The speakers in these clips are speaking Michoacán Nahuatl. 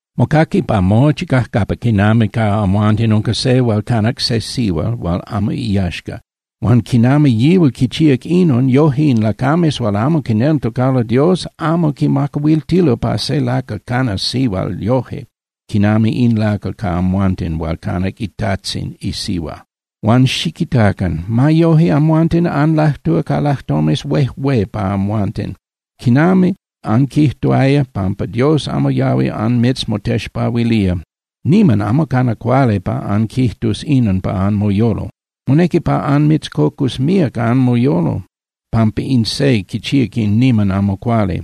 Mocaqui pa mochi cajcapa quinami ca amhuanten unca se hual canac se sihual hual amo iyaxca. Huan quinami yihual quichíac inon, yoje in lacames hual amo quineltocalo Dios amo quimacahuiltilo pa se lacal canas sihual yoje quinami in lacal ca amhuanten hual canac itajtzin isihua. Huan ¡xiquitacan! ¡Ma yoje amhuanten anlajtúa ca lajtomes huejué pa amhuanten quinami anquijtuaya pampa Dios amo yahui anmitzmotexpahuilía! Niman amo cana cuali pa anquijtus inon pa anmoyolo. Monequi pa anmitzcocus míac anmoyolo pampa in se quichíac in niman amo cuali.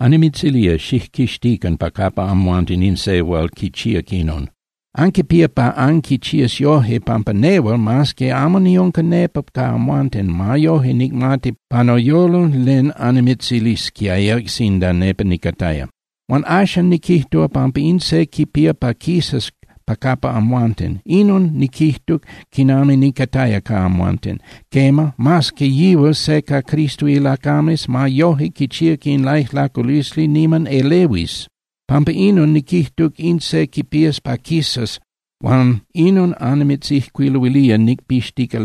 Annimitzilía, xijquixtican pa capa amhuanten in se hual quichíac inon. Anquipía pa anquichías yoje, pampa nehual, mas que amo niunca nepa ca amhuanten, ma yoje nicmati pa noyolo len annimitzilisquiaya sinda nepa nicataya. Huan axan niquijtuc pampa in se quipía pa quisas pa capa amhuanten. Inon niquijtuc quinami nicataya ca amhuanten. Quema, mas que yihual se ca Cristo ilacames, ma yoje quichíac in laijlaculisli niman elehuis. Pampa inon, niquijtuc in se quipías pa quisas huan inon annimitzijcuiluilía nicpixtica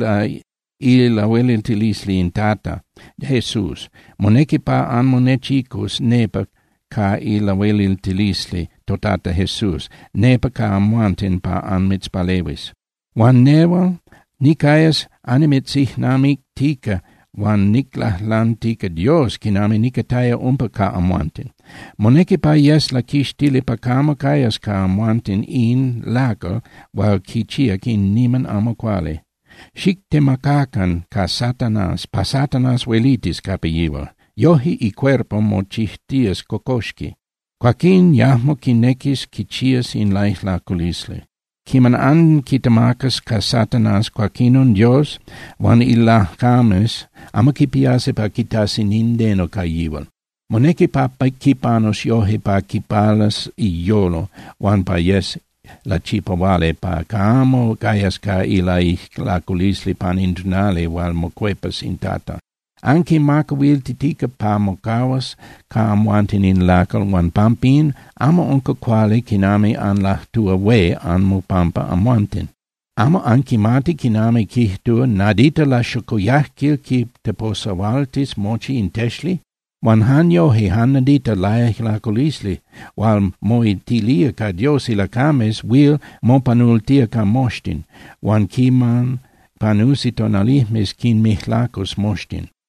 ilahueliltilisli in Tata Jesús. Monequi pa anmonechicus nepa ca ilahueliltilisli toTata Jesús nepa ca amhuanten pa anmitzpalehuis. Huan nehual nicayas annimitzijnamictica huan niclajlantica Dios quinami nicataya umpa ca amhuanten. Monequi pa yes laquixtili pa camo cayas ca amhuanten in lacal hual quichíac in niman amo cuali. Xictemacacan ca Satanás pa Satanás huelitis capa yihual. Yoje icuerpo mochijtías cocoxqui. Cuaquín yajmo quinequis quichías in laijlaculisli. Quiman anquitemacas ca Satanás, cuaquinon Dios huan ilacames yajmo quipiasi pa quitasi nindeno ca yihual. Monequi pa quipanus yoje pa quipalas iyolo huan pa yes lachipahuali pa camo cayas ca ilaijlaculisli pan in tonali hual mocuepas in Tata. Anquimacahuiltitica pa mocahuas ca amhuanten in lacal huan pampín, amo unca cuali quinami anlajtúa hué anmopampa amhuanten. ¿Amo anquimati quinami quijtulo: “Nadita laxocoyajquil quiteposahualtis mochi in texli”? Huan jan yoje, jan nadita laijlaculisli hual moitilía ca Dios ilacames huil mopanultía ca moxtin, huan quiman panusi tonalijmes, quinmijlacus moxtin.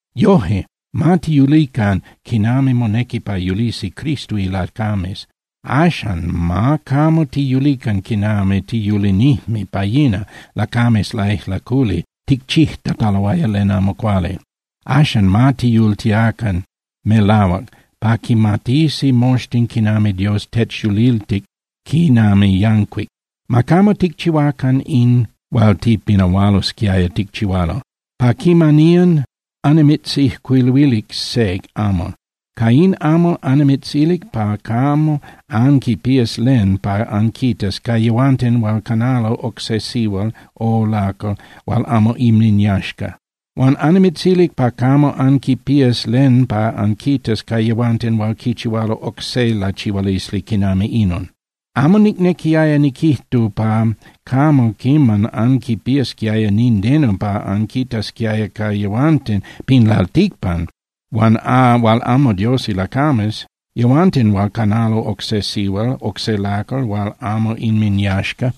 Yoje, ma tiyulican quinami monequi pa yulisi Cristo ilacames. Axan ma camo tiyulican quinami tiyulinijme pa yina, lacames laijlaculi ticchijtataloaya len amo cuali. Axan ma tiyultiacan melahuac pa quimatisi moxtin quinami Dios techyuliltic quinami yancuic. Ma camo ticchihuacan in hual tipinahualosquiaya ticchihualo. Pa quimaniyan annimitzijcuiluilic se amal. Ca in amal annimitzilic pa camo anquipías len pa anquitas ca yehuanten hual canalo oc se sihual o lacal hual amo inminyaxca. Huan annimitzilic pa camo anquipías len pa anquitas ca yehuanten hual quichihualo oc se lachihualisli quinami inon. Amo nicnequiaya niquijtu pa camo quiman anquipiasquiaya nindeno pa anquitasquiaya ca yehuanten pin lalticpan hual amo Dios ilacames, yehuanten hual canalo oc se sihual, oc se lacal hual amo inminyaxca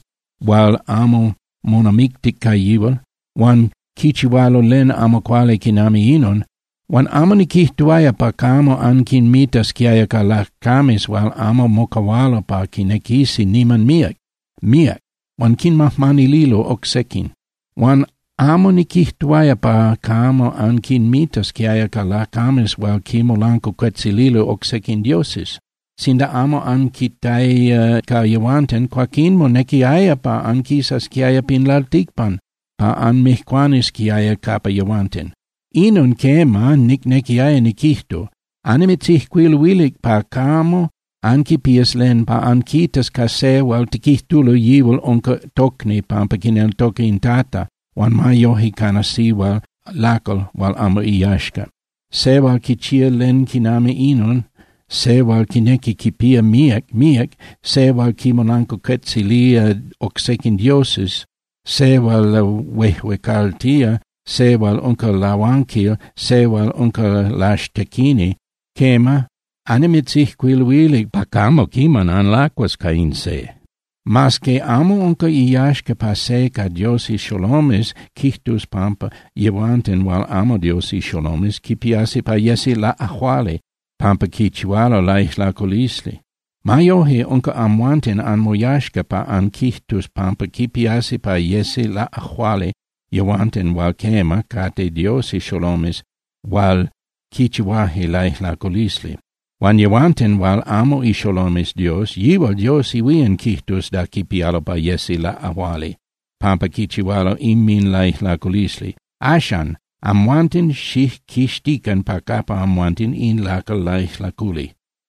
hual amo monamictic ca yihual, huan quichihualo len amo cuali quinami inon. Huan amo niquijtuaya pa camo anquinmitasquiaya ca lacames hual amo mocahualo pa quinequisi niman míac, míac, huan quinmajmanililo oc sequin. Huan amo niquijtuaya pa camo anquinmitasquiaya ca lacames hual quinmolancuacuetzililo oc sequin dioses. Sinda amo anquitaya ca yehuanten, cuaquín monequiaya pa anquisasquiaya pin lalticpan pa anmijcuanisquiaya capa yehuanten. Inon, quema, nicnequiaya niquijtu: Annimitzijcuiluilic pa camo anquipías len pa anquitas ca se hual tiquijtulo yihual unca tocni pampa quineltoca in Tata huan ma yoje cana sihual, lacal hual amo iyaxca, se hual quichía len quinami inon, se hual quinequi quipía míac, míac, se hual quinmolancuacuetzilía oc sequin dioses, se hual lahuejuecaltía, se hual unca lahuanquil, se hual unca laxtequini. Quema, annimitzijcuiluilic pa camo quiman anlacuas ca in se. Mas que amo unca iyaxca pa se ca Dios ixolomes quijtus pampa yehuanten hual amo Dios ixolomes quipiasi pa yesi laꞌajuali pampa quichihualo laijlaculisli, ma yoje, unca amhuanten anmoyaxca pa anquijtus pampa quipiasi pa yesi laꞌajuali yehuanten hual quema, cate Dios ixolomes hual quichihuaje laijlaculisli. Huan yehuanten hual amo ixolomes Dios, yihual Dios ihuían quijtus da quipialo pa yesi laꞌajuali pampa quichihualo inminlaijlaculisli. Axan, amhuanten xijquixtican pa capa amhuanten in lacal laijlaculi.